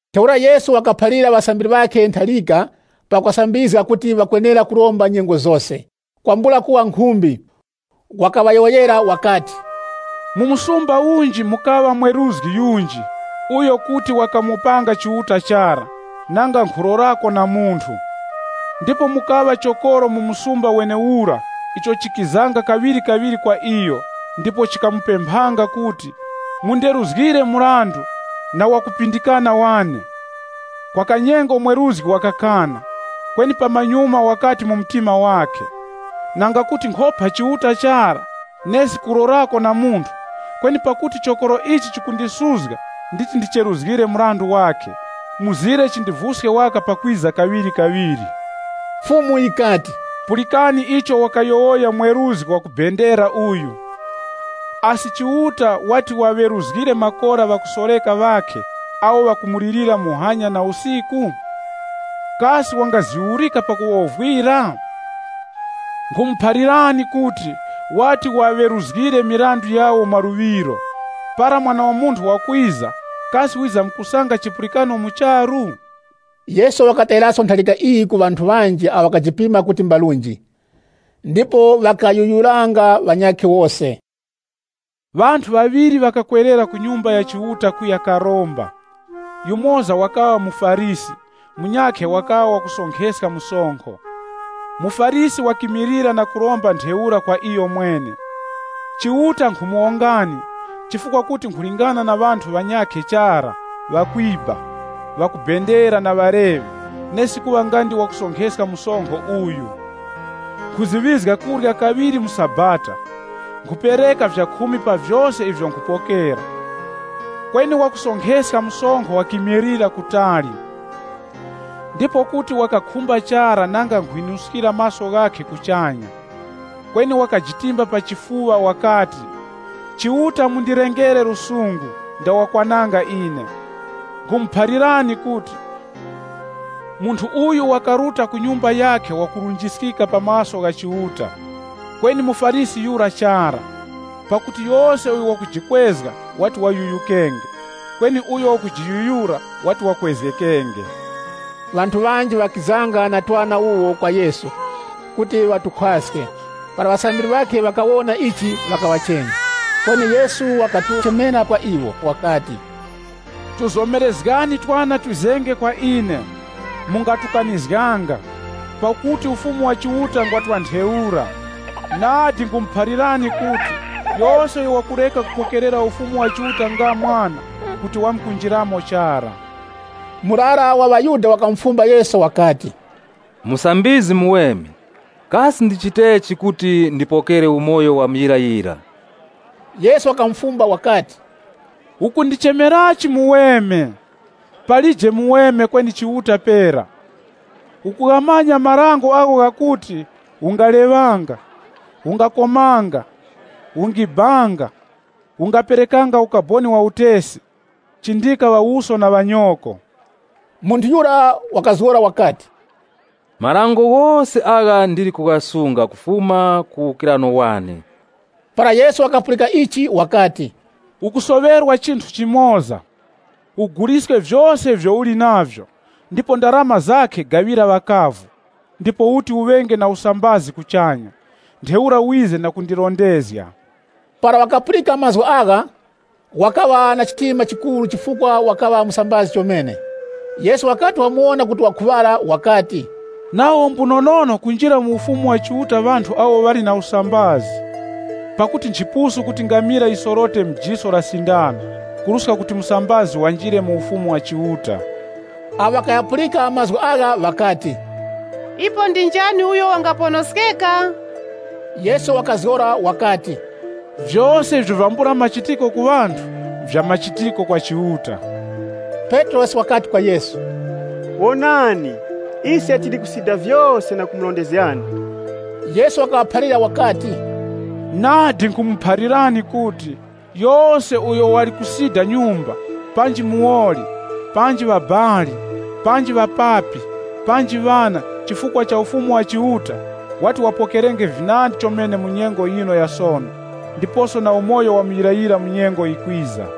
Ntheura Yesu wakaphalira ŵasambiri ŵakhe ntharika pakuŵasambizga kuti ŵakwenera kuromba nyengo zose, kwambula kuwa nkhumbi. Wakaŵayowoyera wakati, “Mu msumba unji mukaŵa mweruzgi yunji uyo kuti wakamopanga Chiuta chara, nanga nkhulorako na munthu. Ndipo mukaŵa chokoro mu msumba wenewura icho chikizanga kaŵirikaŵiri kwa iyo ndipo chikamupemphanga kuti, ‘Munderuzgire mrandu na wakupindikana wane!’ Kwa kanyengo mweruzgi wakakana, kweni pamanyuma wakati mu mtima wakhe, ‘Nanga kuti nkhopa Chiuta chara, nesi kulorako na munthu, kweni pakuti chokoro ichi chikundisuzga nditi ndicheruzgire mrandu wakhe, mzire chindivuske waka pakwiza kaŵirikaŵiri.’” Fumu yikati, “Pulikani icho wakuyowoya mweruzgi wakubendera uyu. Asi Chiuta wati waŵeruzgire makora ŵakusoreka ŵakhe awo ŵakumulirira muhanya na usiku? Kasi wangaziurika pakuwovwira? Nkhumuphalirani kuti wati waŵeruzgire mirandu yawo mwa luŵiro. Para Mwana wa Munthu wakwiza kasi wizamkusanga chipulikano mu charu?” Yesu wakatayiraso ntharika iyi ku ŵanthu ŵanji awo ŵakajipima kuti mbarunji, ndipo ŵakayuyuranga ŵanyakhe wose. “Ŵanthu ŵaŵiri ŵakakwerera ku Nyumba ya Chiuta kuya karomba. Yumoza wakaŵa muFarisi, munyakhe wakaŵa wakusonkheska msonkho. MuFarisi wakimilira na kuromba ntheura kwa iyomwene, ‘Chiuta nkhumuwongani, chifukwa kuti nkhulingana na ŵanthu ŵanyakhe chara: ŵakwiba, ŵakubendera na ŵaleŵe, nesi kuŵa nga ndi wakusonkheska msonkho uyu. Nkhuziŵizga kurya kaŵiri mu sabata, nkhupereka vyakhumi pa vyose ivyo nkhupokera.’ “Kweni wakusonkheska msonkho wakimilira kutali. Ndipo kuti wakakhumba chara nanga nkhwinuskira maso ghakhe kuchanya. Kweni wakajitimba pa chifuŵa wakati, ‘Chiuta mundilengere lusungu, nda wakwananga ine.’” Nkhumuphalirani kuti “Munthu uyu wakaruta ku nyumba yakhe wakurunjiskika pa maso gha Chiuta, kweni muFarisi yura chara. Pakuti yose uyo wakujikwezga wati wayuyukenge, kweni uyo wakujiyuyura wati wakwezgekenge.” Ŵanthu ŵanji ŵakizanga na twana wuwo kwa Yesu, kuti watukhwaske. Para ŵasambiri ŵakhe ŵakawona ichi ŵakaŵachenya. Kweni Yesu wakatuchemera kwa iwo wakati, “Tuzomerezgani twana twizenge kwa ine, mungatukanizganga. Pakuti Ufumu wa Chiuta ngwa twa ntheura. Nadi nkhumuphalirani kuti, yose uyo wakureka kupokerera Ufumu wa Chiuta nga mwana, kuti wamkunjiramo chara.” Murara wa ŵaYuda wakamufumba Yesu wakati, “Musambizgi muweme, kasi ndichitechi kuti ndipokere umoyo wa muyirayira?” Yesu wakamufumba wakati, “Ukundichemerachi muweme? Palije muweme, kweni Chiuta pera. Ukughamanya marango agho ghakuti, ‘Ungaleŵanga, Ungakomanga, Ungibanga, Ungaperekanga ukaboni wa utesi, Chindika ŵawuso na ŵanyoko.’” Munthu yura wakazgora wakati, “Marango ghose agha ndili kughasunga kufuma ku uwukirano wane.” Para Yesu wakapulika ichi wakati, “Ukusoŵerwa chinthu chimoza. Uguliske vyose ivyo uli navyo, ndipo ndarama zakhe gaŵira ŵakavu, ndipo uti uŵenge na usambazi kuchanya. Ntheura wize na kundirondezga.” Para wakapulika mazgu agha, wakaŵa na chitima chikuru chifukwa wakaŵa musambazi chomene. Yesu wakati wamuwona kuti wakhuŵara wakati, “Nawo mbunonono kunjira mu Ufumu wa Chiuta ŵanthu awo ŵali na usambazi. Pakuti nchipusu kuti ngamila yisorote mu jiso la sindano, kuruska kuti musambazi wanjire mu Ufumu wa Chiuta.” Awo ŵakaghapulika mazgu agha ŵakati, “Ipo ndi njani uyo wangaponoskeka?” Yesu wakazgora wakati, “Vyose ivyo nvyambula machitiko ku ŵanthu, nvyamachitiko kwa Chiuta.” Petrosi wakati kwa Yesu, “Wonani ise tili kusida vyose na kumurondezgani.” Yesu wakaŵaphalira wakati, “Nadi nkhumuphalirani kuti, yose uyo wali kusida nyumba, panji muwoli, panji ŵabali, panji ŵapapi, panji ŵana, chifukwa cha Ufumu wa Chiuta, wati wapokerenge vinandi chomene mu nyengo yino ya sono, ndiposo na umoyo wa muyirayira mu nyengo yikwiza.”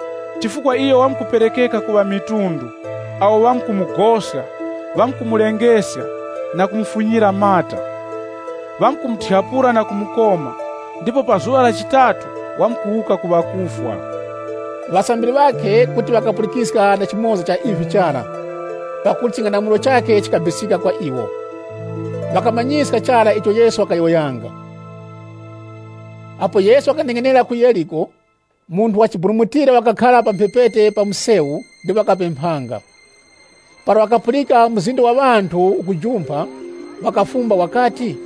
Chifukwa iyo wamkuperekeka ku ŵamitundu, awo ŵamkumugoska, ŵamkumulengeska, na kumufunyira mata. Ŵamkumuthyapula na kumukoma, ndipo pa zuŵa la chitatu wamkuwuka ku ŵakufwa.” Ŵasambiri ŵakhe kuti ŵakapulikiska na chimoza cha ivi chara. Pakuti ching'anamulo chakhe chikabisika kwa iwo. Ŵakamanyiska chara icho Yesu wakayowoyanga. Apo Yesu wakaneng'enera ku Yeriko, munthu wachiburumutira wakakhara pa mphepete pa msewu ndipo wakapemphanga. Para wakapulika mzinda wa ŵanthu ukujumpha, wakafumba wakati,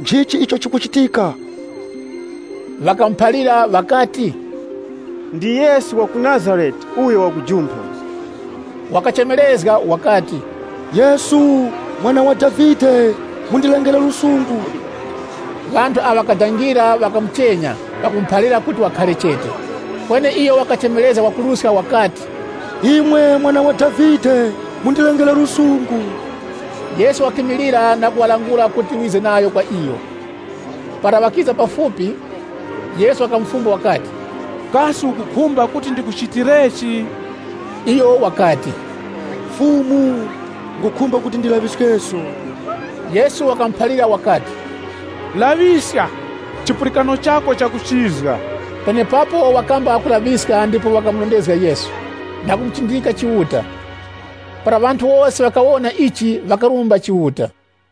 “Nchichi icho chikuchitika?” Ŵakamuphalira ŵakati, “Ndi Yesu wa ku Nazarete uyo wakujumpha.” Wakachemerezga wakati, “Yesu, Mwana wa Davide, mundilengere lusungu!” Ŵanthu awo ŵakadangira ŵakamuchenya pakumuphalira kuti wakhare chete. Kweni iyo wakachemerezga kwakuruska wakati, “Imwe Mwana wa Davide, mundilengere lusungu!” Yesu wakimilira na kuŵalangula kuti ŵize nayo kwa iyo. Para ŵakiza pafupi, Yesu wakamufumba wakati, “Kasi ukukhumba kuti ndikuchitirechi?” Iyo wakati, “Fumu, nkhukhumba kuti ndilaŵiskeso.” Yesu wakamuphalira wakati, “Laŵiska! Chipulikano chako chakuchizga.” Penepapo wakamba kulaŵiska ndipo wakamurondezga Yesu na kumuchindika Chiuta. Para ŵanthu wose ŵakawona ichi, ŵakarumba Chiuta.